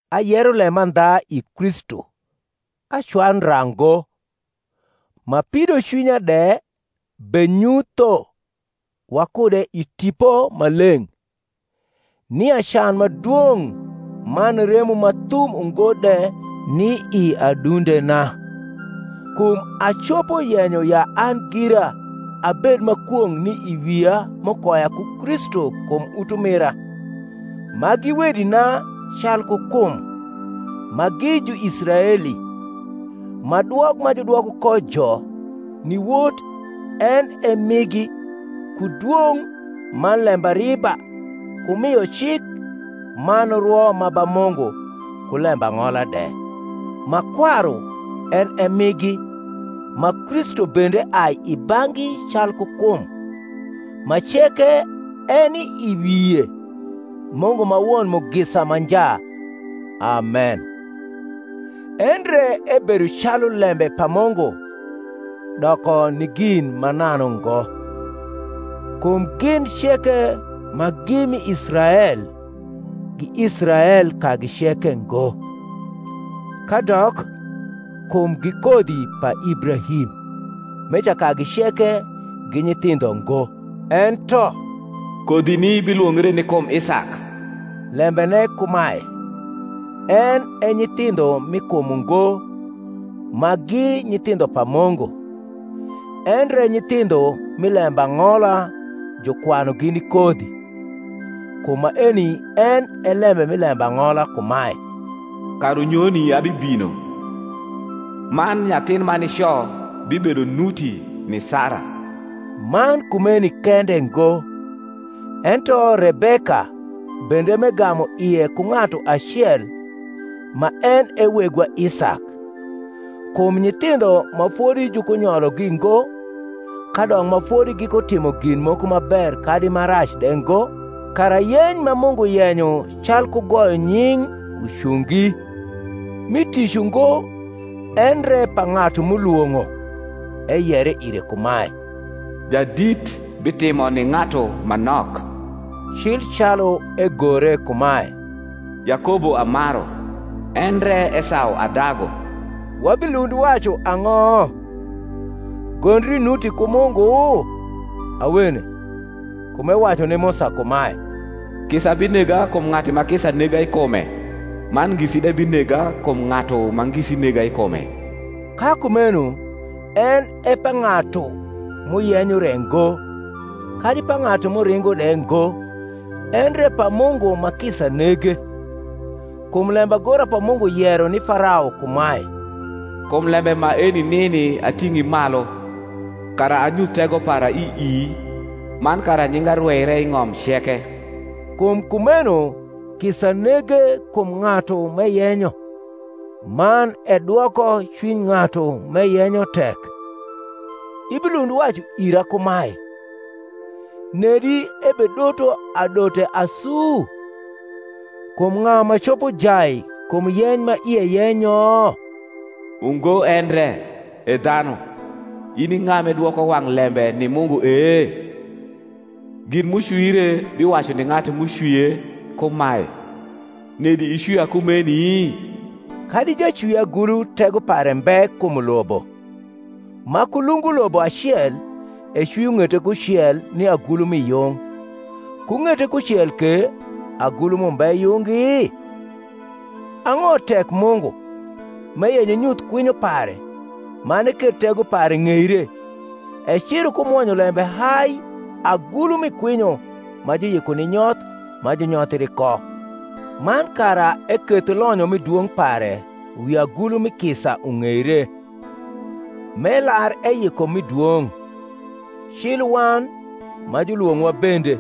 Ayero lemandha i Kristu, acwayu ndra ngo, ma pidocwinya de benyutho wakude i Tipo Maleng’, nia can ma dwong’ man remo ma thum ungo de ni i adundena. Kum acopo yenyo ya an gira abed ma kwong’ ni i wia m’ukoya ku Kristu kum utumira, ma gi wedina calku kum: ma gi Juisraeli; ma dwok ma judwoko ko jo ni wot en e migi, ku dwong’, man lembariba, ku mio cik, man rwo ma ba Mungu, ku lembang’ola de; ma kwaru en e migi, ma Kristu bende ai i bang’gi calku kum, ma ceke eni i wie, Mungu ma won mugisa ma nja. Amen. Endre ebedo calu lembe pa Mungu doko ni gin mananu ngo. Kum gin ceke ma gi mi Israel, gi Israel kagi ceke ngo: kadok, kum gi kodhi pa Ibrahim, meca kagi ceke gi nyithindho ngo: ento kodhini bilwongre ni kum Isak. Lembene kumae, en e nyithindho mi kum ungo ma gi nyithindho pa Mungu; endre nyithindho mi lembang’ola jukwanugi ni kodhi. Kum maeni en e lembe mi lembang’ola kumae, Karunyoni abibino, man nyathin ma nico bibedo nuti ni Sara. Man kumeni kende ngo; ento Rebeka bende m’egamu ie ku ng’atu acel, ma en e wegwa Isak, kum nyithindho ma fodi jukunyologi ngo, kadok ma fodi gikutimo gin moko ma ber kadi ma rac de ngo, kara yeny ma Mungu yenyo calku goyo nying’ ucungi, mi tic ungo, endre pa ng’atu m’ulwong’o, eyere ire kumae, Jadit bitimo ni ng’atu ma nok. Cil calu egore kumae, Yakobo amaru. endre Esau adagu. Wabilund wacu ang’o? Gondri nuti ku Mungu? Awene. Kum ewacu ni Musa kumae, Kisa binega kum ng’atu ma kisa nega i kume, man ngisi de binega kum ng’atu ma ngisi nega i kume. Ka kumeno en e pa ng’atu m’uyenyo re ngo, kadi pa ng’atu m’uringo de ngo, endre pa Mungu ma kisa nege. Kum lembagora pa Mungu yero ni Farao kumae, Kum lembe maeni nini ating’i malu, kara anyuth tego para i ii, man kara nyinga rweire i ng’om ceke. Kum kumeno kisa nege kum ng’atu m’eyenyo; man edwoko cwiny ng’atu m’eyenyo tek. Ibilund wacu ira kumae, Nedi ebedoto adote asu? Kum ng’a ma copo jai kum yeny ma ie yenyo? Ungo endre, E dhanu, in i ng’a m’idwoko wang’ lembe ni Mungu e? Gin m’ucwire biwacu ni ng’atu m’ucwie kumae, Nedi icwia kumeni? Kadi jacwiagulu tego pare mbe kum ulobo, ma ku lungu ulobo acel ecwio ng’ete kucel ni agulu mi yung, ku ng’ete kucel ke agulu m’umbe yungi? Ang’o tek Mungu, m’eyenyo enyuth kwinyo pare, man eketh tego pare ng’eire, eciro ku mwonyolembe hai agulu mi kwinyo ma juyiko ni nyoth ma junyothri ko: man kara eketh lonyo mi dwong’ pare wi agulu mi kisa ung’eire, m’elar eyiko mi dwong’, cil wan, ma julwong’owa bende,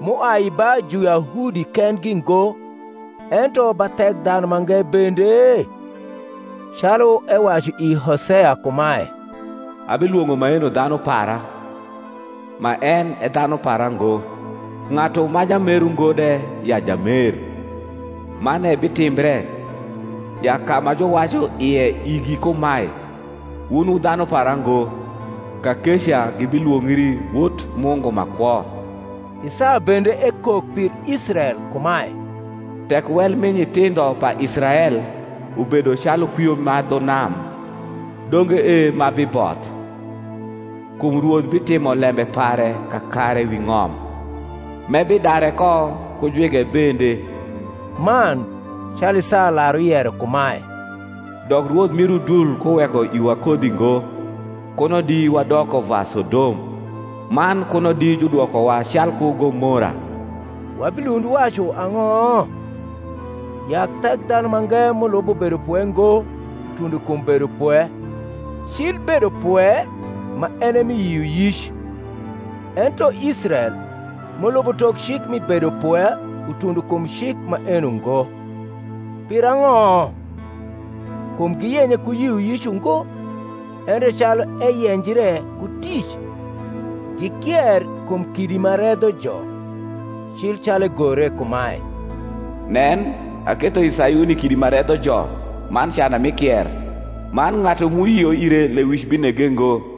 m’uai ba Juyahudi kendgi ngo, ento ba Thekdhanumange bende? Calu ewacu i Hoseya kumae, Abilwong’o maeno dhanu para, ma en e dhanu para ngo; Ng’atu ma jamer ungo de, ya jamer. Man ebitimbre, ya ka ma juwacu ie igi kumae, Wun wu dhanu para ngo, Kakeca gibilwongri wot Mungu ma kwo. Isaya bende ekok pir Israel kumae, Tek wel mi nyithindho pa Israel ubedo calu kwio ma dhu nam, donge e ma biboth: kum Rwoth bitimo lembe pare kakare wi ng’om, m’ebidare ko ku jwige bende. Man, calu Isaya lar uyero kumae, Dok Rwoth mir Udul kuweko iwa kodhi ngo, Kuno di wadoko va Sodom, man kuno di judwokowa calku Gomora. Wabilund wacu ang’o? Ya Thekdhanumange, m’ulubo bedopwe ngo, utundo kum bedopwe, cil bedopwe ma en e mi yioyic: ento Israel, m’ulubo tok cik mi bedopwe utundo kum cik maeno ngo. Pirang’o? Kum giyenye ku yioyic ungo, endre calu eyenjre ku tic. Gikier kum kidi ma redhojo; cil calu egore kumae, Nen, aketho i Sayuni kidi ma redhojo man cana mi kier: Man ng’atu m’uyio ire lewic binege ngo.